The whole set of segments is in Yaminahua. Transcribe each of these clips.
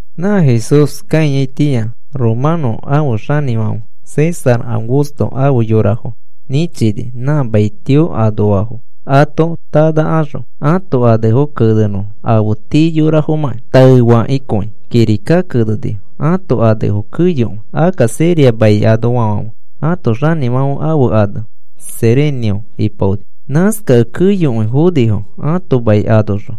Nã Jesús kãiyaitĩa romanõ ãfe xanĩfãfe César Augusto ãfe yorafo nĩchini nã maitio anoafo ato tanãkaxõ ãto anefo kenenõfo afe tii yorafomakĩ. Taefakĩkõi kirika kenenifo ãto anefo keyokõi. Akka Siria mai anoafãfe ãto xanĩfãfe ane Cirenio ipaoni. Nãskakẽ keyokõi fonifo ãto mai anoxõ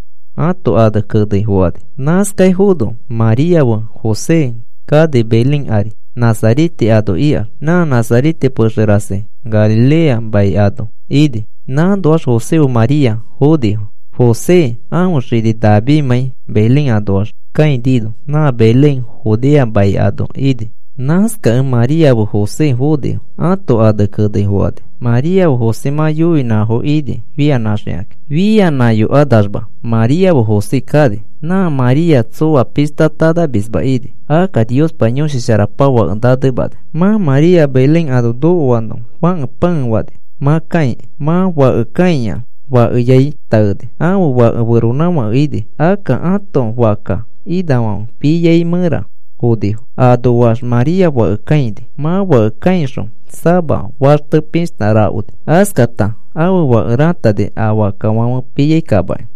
ãto ane kenei fokani. Nãskaifono María feri José kani Belén ari, Nazarete ano ikanax. Nã Nazarete pexe rasi Galilea mai anoa ini. Nãnoax José fe María fonifo, José ãfe xini Davidmãi Belén anoax kãinino. Nã Belén Judea mai anoa ini. Nãskakẽ María fe José fonifo ãto ane kenei fokani. María fe José mã yoinãfo ini fianãxikakĩ. Fianãyokanamax María fe José kani. Nã María tsoa pishta tanamisma ini, akka Niospa Yõshi Sharapa fake nanemani. Mã María Belén ano nokoano fãke pãe fani mã kãiki. Mã fake kãiax fakeyai taeni. Ãfe fake feronãfake ini. Akka ãto fakka inafãfe piai mẽra fonifo. Anoax María fake kãini. Mã fake kãixõ sama faxte pishta rakoni. Askata ãfe fake rãtani a fakkafãfe piai kamaki.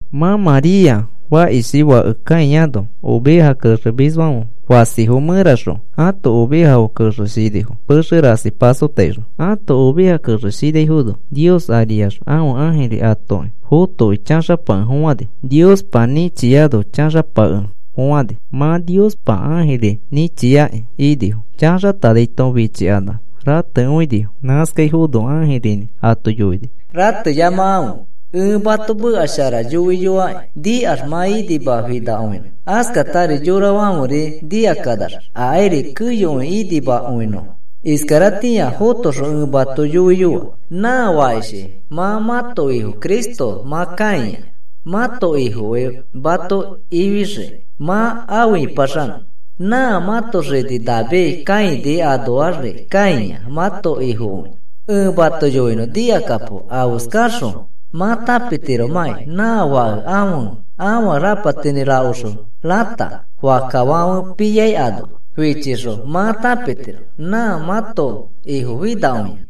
Nã María fakishi fake kãiano oveja kexemisfãfe fasifo mẽraxõ ãto ovejafo kexeshinifo pexe rasi pasotaixõ. Ãto ovejafo kexeshinaifono Nios ariax ãfe ãjiri atoki fotokĩ chaxapakefofãni. Niospa nĩchiano chaxapakefofãni. Mã Niospa ãjiri nĩchiakĩ inifo chaxatanaito fichikanax ratekõinifo. Nãskaifono ãjirinĩ ato yoini: “Rateyamakãfe. Ẽ mato meka shara yoiyoaki nikax mã inimai finakõinõ. Askatari yorafãferi nikakanax akairi keyokõi inimakõinõfo. Iskaratĩa fotoxõ ẽ mato yoiyoa. Nã fakishi mã mãto Ifo Cristo mã kãia mãto Ifokõi mato ifixiki mã afe ĩpaxanõ. Nã mãto xini David kãini anoaxri kãia mãto Ifokõi. Ẽ mato yoinõ nikakapo afeskaxõ mã tãpitiromakĩ nã fake ãfe afa rapatinĩ rakoxõ rãta fakkafãfe piai ano fichixõ mã tãpitiro nã mãto Ifo finakõia,”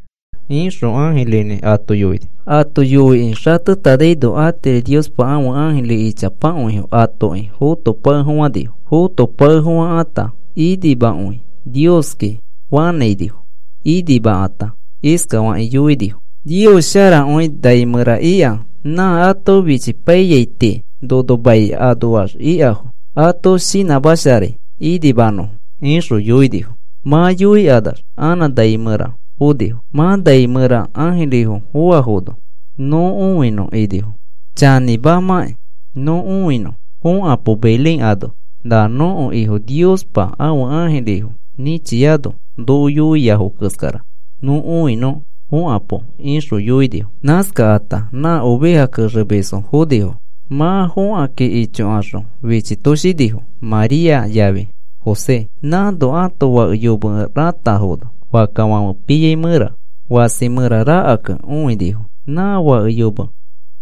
ixõ ãjirinĩ ato yoini. Ato yoikĩ xatetanaino atiri Niospa ãfe ãjiri ichapakõifo atoki fotopakefofãni. Fotopakefofãkata inimakõi Nioski fanãinifo. Inimakata iskafakĩ yoinifo: Nios sharakõi nai mẽra ika. Nã ato fichipaiyai tii nono mai anoax ikafo ato shinãmasharai inimanõfo, ixõ yoinifo. Mã yoikanax anã nai mẽra fonifo. Mã nai mẽra ãjirifo foafono, “Nõ õinõ,” inifo, “Chanĩmamakĩ nõ õinõ, fokapo Belén ano na nõko Ifo Niospa ãfe ãjirifo nĩchiano noko yoiafo keskara nõ õinõ fokapo,” ixõ yoinifo. Nãskata nã oveja kexemisfo fonifo. Mã fokakĩ ichokaxõ fichitoshinifo María yafi José. Nãno ãto fake yome rãtafono fakkafãfe piai mẽra fasi mẽra rakakẽ õinifo. Nã fake yome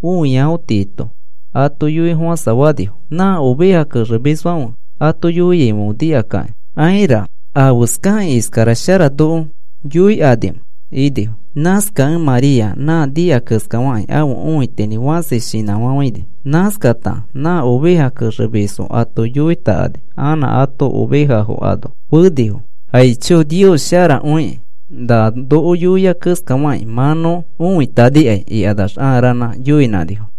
õiafo tiito ato yoifofãsafanifo. Nã oveja kexemisfãfe ato yoiaifãfe nikakakĩ, “Aira, ¿afeskakĩ iskara shara noko yoikanimẽ?” inifo. Nãskakẽ María nã nika keskafakĩ ãfe õitinĩ fãsi shinãfafãini. Nãskakata nã oveja kexemisfo ato yoitakani anã ato ovejafo ano fenifo. “Aicho, Nios sharakõikĩ nã noko yoia keskafakĩ mã nõ õitanikai,” ikanax ãa ranã yoinãnifo.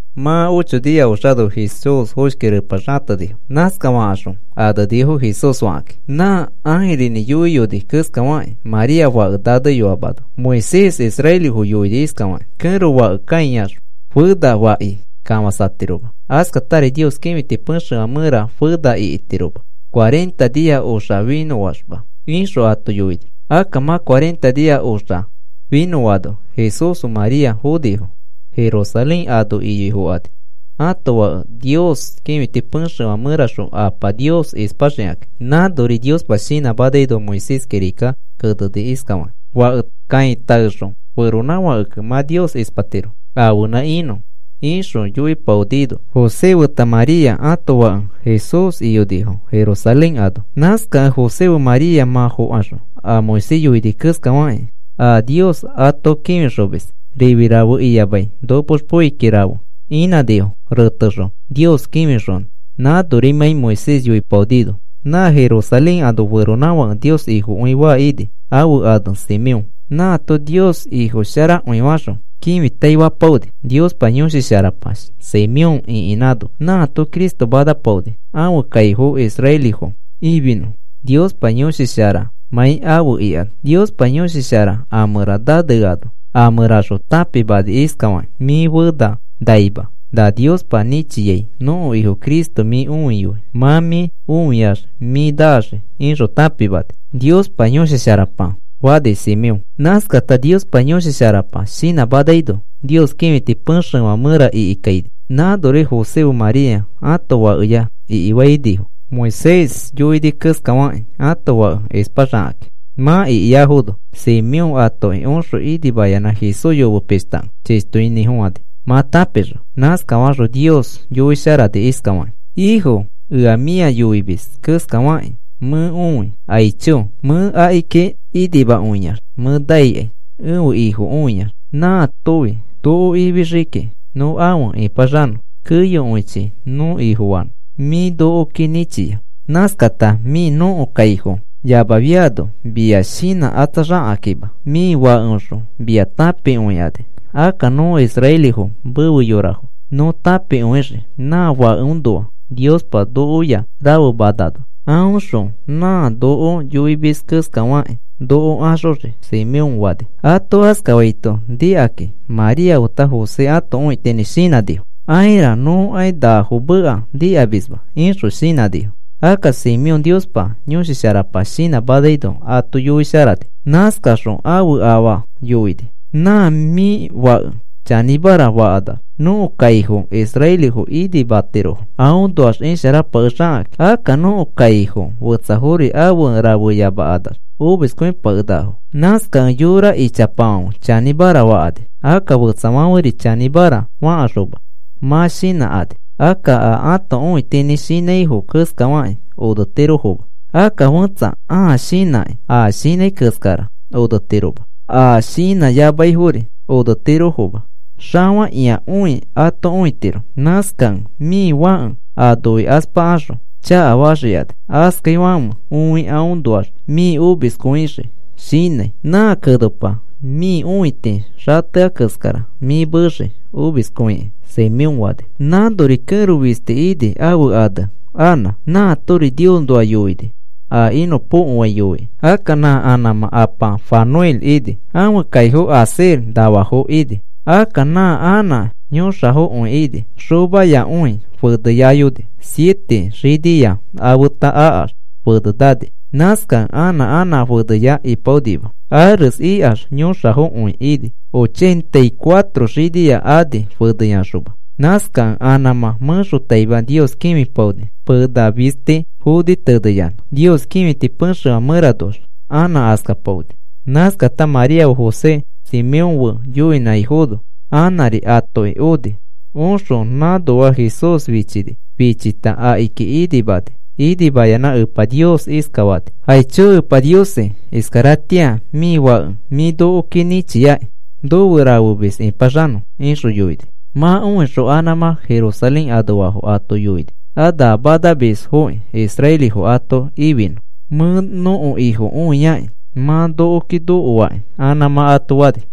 Mã ocho nia oxano Jesús foshki repa xatenifo. Nãskafakaxõ anenifo Jesús fakakĩ, nã ãjirinĩ yoiyoni keskafakĩ María fake naneyoamano. Moisés israelifo yoini iskafakĩ: “Kẽro fake kãiax fena faki kafãsatiroma. Askatari Nios kĩfiti pexefã mẽra fena ikitiroma cuarenta nia oxa finõaxma,” ixõ ato yoini. Akka mã cuarenta nia oxa finõano José fe María fonifo. Jerusalén ano iyoifokani ãto fake Nios kĩfiti pexefã mẽraxõ Apa Nios ispaxikakĩ. Nãnori Niospa shinãmanaino Moisés kirikaki keneni iskafakĩ: “Fake kãi taexõ feronãfakekẽ mã Nios ispatiro ãfenã inõ,” ixõ ato yoipaonino, José feta María ãto fake Jesús iyonifo Jerusalén ano. Nãskakẽ José fe María mã fokaxõ a Moisés yoini keskafakĩ a Nios ato kĩfixomis rifi rafe iyamai nopoxpoiki rafe inãnifo retexõ Nios kĩfixonõ nãnorimãi Moisés yoipaonino. Nã Jerusalén anoa feronãfake Nios Ifokõi faa ini, ãfe ane Simeón. Nãato Nios Ifo sharakõi faxõ kĩfitaifapaoni. Niospa Yõshi Sharapa Simeón ĩkinãno, nãato Cristo manapaoni, ãfe kaifo israelifo ifinõ Niospa Yõshi Sharamãi afe ikano. Niospa Yõshi Shara a mẽra naneano a mẽraxõ tãpimani iskafakĩ: “Mĩ fena naima na Niospa nĩchiai nõko Ifo Cristo mĩ õiyoi mã mĩ õiax mĩ naxii,” ixõ tãpimani, Niospa Yõshi Sharapa Simeón. Nãskata Niospa Yõshi Sharapa shinãmanaino Nios kĩfiti pexefã mẽra ikikaini. Nãnori José fe María ãto fakeya ikifainifo, Moisés yoini keskafakĩ ãto fake ispaxakakĩ. Mã ikiafono, Simeón atoki oxõ inimayanã Jesús yome pishtakẽ chishtoinĩfofãni, mã tãpixõ. Nãskafaxõ Nios yoisharani iskafakĩ: Ifo, ea mĩa yoimis keskafakĩ mẽ õi. Aicho, mẽ akiki inimakõiax mẽ naikai ẽfe Ifo õiax. Nãatofi noko ifixii kiki nõ afe ĩpaxanõ. Keyokõichi nõ Ifofanõ mĩ nokoki nĩchia. Nãskata mĩ nõko kaifo yamafiano mia shinãkatsaxakakĩma mĩ fãkeoxõ mia tãpikõikani. Akka nõ israelifo mefe yorafo nõ tãpikõixii, nã fakeõnoa Niospa nokoya rafemanano. Aõxõ nã noko yoimis keskafakĩ noko axoxii, Simeón fani. Ato askafaito nikakĩ María feta José ãto õitinĩ shinãnifo: “Aira, nõkai nafo meka nikamisma,” ixõ shinãnifo. Akka Simeón Niospa Yõshi Sharapa shinãmanaino ato yoisharani. Nãskaxõ ãfe afa yoini: “Nã mĩ fake chanĩmara fakanax nõko kaifofo israelifo inimatirofo. Aõnoax isharapakexakakĩ. Akka nõko kaifo fetsafori afe rafeyamakanax omiskõipakenakafo. Nãskakẽ yora ichapafãfe chanĩmara fakani. Akka fetsafãferi chanĩmara fakaxõ mã shinãkani. Akka a ãto õitinĩ shinãifo keskafakĩ onetirofoma. Akka fẽtsa ãa shinãkĩ a shinãi keskara onetiroma. A shinãyamaifori onetirofoma. Xafakĩakõi ato õitiro. Nãskakẽ mĩ fake aa noikaspakaxõ chakafaxikani. Askafaifãfe õi aõnoax mĩ omiskõixii shinãi. Nã kenopa mĩ õiti xatea keskara mĩ meexii omiskõikĩ,” Simeón fani. Nãnori kẽro fistiri ini, ãfe ane Anã. Nãatori Niosnoa yoini, a inõpokoai yoikĩ. Akka nã Anãmã apa Fanuel ini. Ãfe kaifo Aser nafafo ini. Akka nã Anã yõxafokõi ini. Xomayakõi feneyayoni, siete xinia afeta akax fene nani. Nãskakẽ anã Anã feneya ipaonima. Ares ikax yõxafokõi ini ochenta y cuatro xinia ani feneyaxoma. Nãskakẽ Anãmã mẽxotaima Nios kĩfipaoni, pena fisti foni teneyanã. Nios kĩfiti pexefã mẽranoax Anã askapaoni. Nãskata María fe José Simeón fe yoinãifono Anãri atoki oni. Oxõ nãnoa Jesús fichini. Fichita akiki inimani. Inimayanã Epa Nios iskafani: “Aicho Epa Niosi, iskaratĩa mĩ Fake mĩ nokoki nĩchiaki nofe rafemis ĩpaxanõ,” ixõ yoini. Mã õixõ Anãmã Jerusalén anoafo ato yoini a na manamisfoki israelifo ato ifinõ. “Mẽ nõko Ifo õiaki mã nokoki nokoaki,” Anãmã ato fani.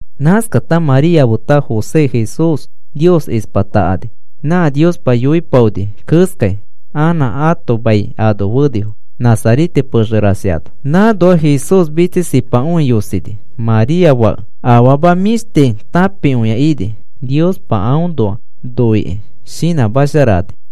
Nãskata María feta José Jesús Nios ispatakani, nã Niospa yoipaoni keskai anã ãto mai ano fenifo, Nazarete pexe rasi ano. Nãnoax Jesús mitsisipakõi yosini María fake. Afama mĩshti tãpiakõi ini. Niospa aõ noikĩ shinãmasharani.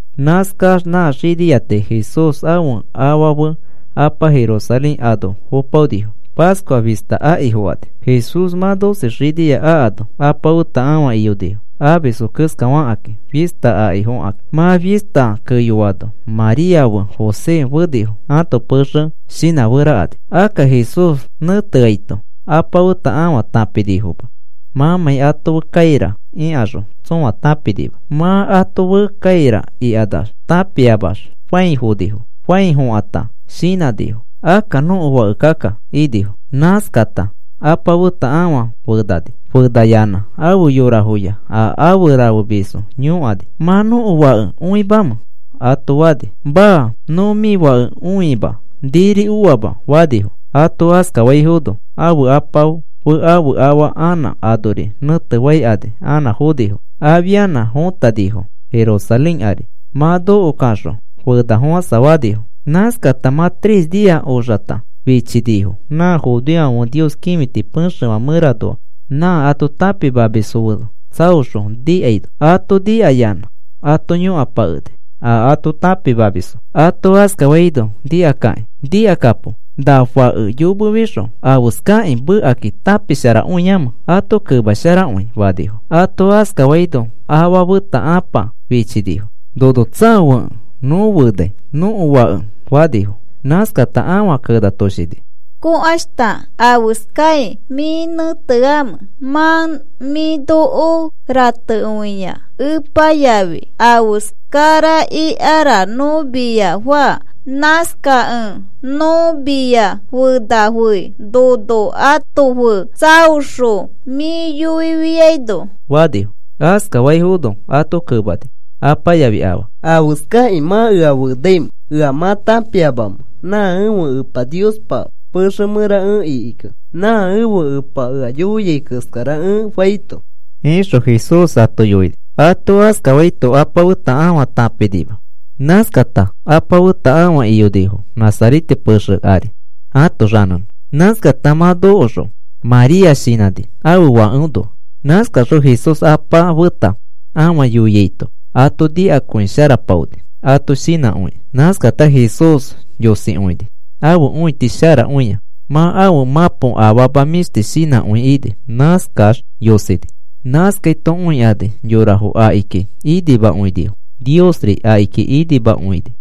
Nãskax nã xinia tii Jesús ãfe afa fe apa Jerusalén ano fopaonifo. Pascua fista aki fokani. Jesús mã doce xinia akano apa feta ãfa iyonifo, amisfo keskafakakĩ fista akifokakĩ. Mã fista keyoano María fe José fenifo, ãto pexe shinãferakani. Akka Jesús nẽteaito apa feta ãfa tãpinifoma, mãmãi ato fe kaira ikaxõ tsõa tãpinima. Mã ato fe kaira ikanax tãpiamax fãi fonifo. Fãi fokãta shinãnifo akka nõko fake akka inifo. Nãskata apa feta ãfa fenani. Fenayanã afe yorafoya a afe rafemisfo yõkani: “¿Mã nõko fake õimamẽ?” ato fani. “Maa, nõ mĩ fake õima. Niri oama,” fanifo. Ato askafaifono ãfe apa fe ãfe afa anã anori nẽtefaikani anã fonifo. Afianã fõtanifo Jerusalén ari. Mã nokokaxõ fenafofãsafanifo. Nãskata mã tres nia oxakata fichinifo nã judeofãfe Nios kĩfiti pexefã mẽranoa nã ato tãpimamisfo fe tsaoxõ nikaino. Ato nikayanã ato yõkapakeni a ato tãpimamisfo. Ato askafaino nikakakĩ, “Nikakapo, ¿na fãke yomefixõ afeskakĩ mekakĩ tãpisharakõiamẽ? Ato kemasharakõi,” fanifo. Ato askafaino afa feta ãpa fichinifo. “Nono tsaofekẽ nõ fenai nõko fake,” fanifo. Nãskata ãfa kenatoshini: “Kõkaishta, ¿afeskai mĩ nẽteamẽ? Mã mĩ noko ratekõia epa yafi. Afeskara ikara nõ mia faa. Nãskakẽ nõ mia fenafei nono ato fe tsaoxõ mĩ yoifiaino,” fanifo. Askafaifono ato kemani apa yafi afa: “¿Afeskakĩ mã ea fenaimẽ? ¿Ea mã tãpiamamẽ nã ẽfe Epa Niospa pexe mẽra ẽ ikikẽ nã ẽfe Epa ea yoiai keskara ẽ faito?” ixõ Jesús ato yoini. Ato askafaito apa feta ãfa tãpinima. Nãskata apa feta ãfa iyonifo Nazarete pexe ari ato xanẽnẽ. Nãskata mã nokoxõ María shinãni ãfe fakeõnoa. Nãskaxõ Jesús apa feta ãfa yoiaito ato nikakõisharapaoni ato shinãkõikĩ. Nãskata Jesús yosikõini, ãfe õiti sharakõia. Mã ãfe mãpo afama mĩshti shinãkõi ini. Nãskax yosini. Nãskaito õikani yorafo akiki inimakõinifo. Niosri akiki inimakõi ini.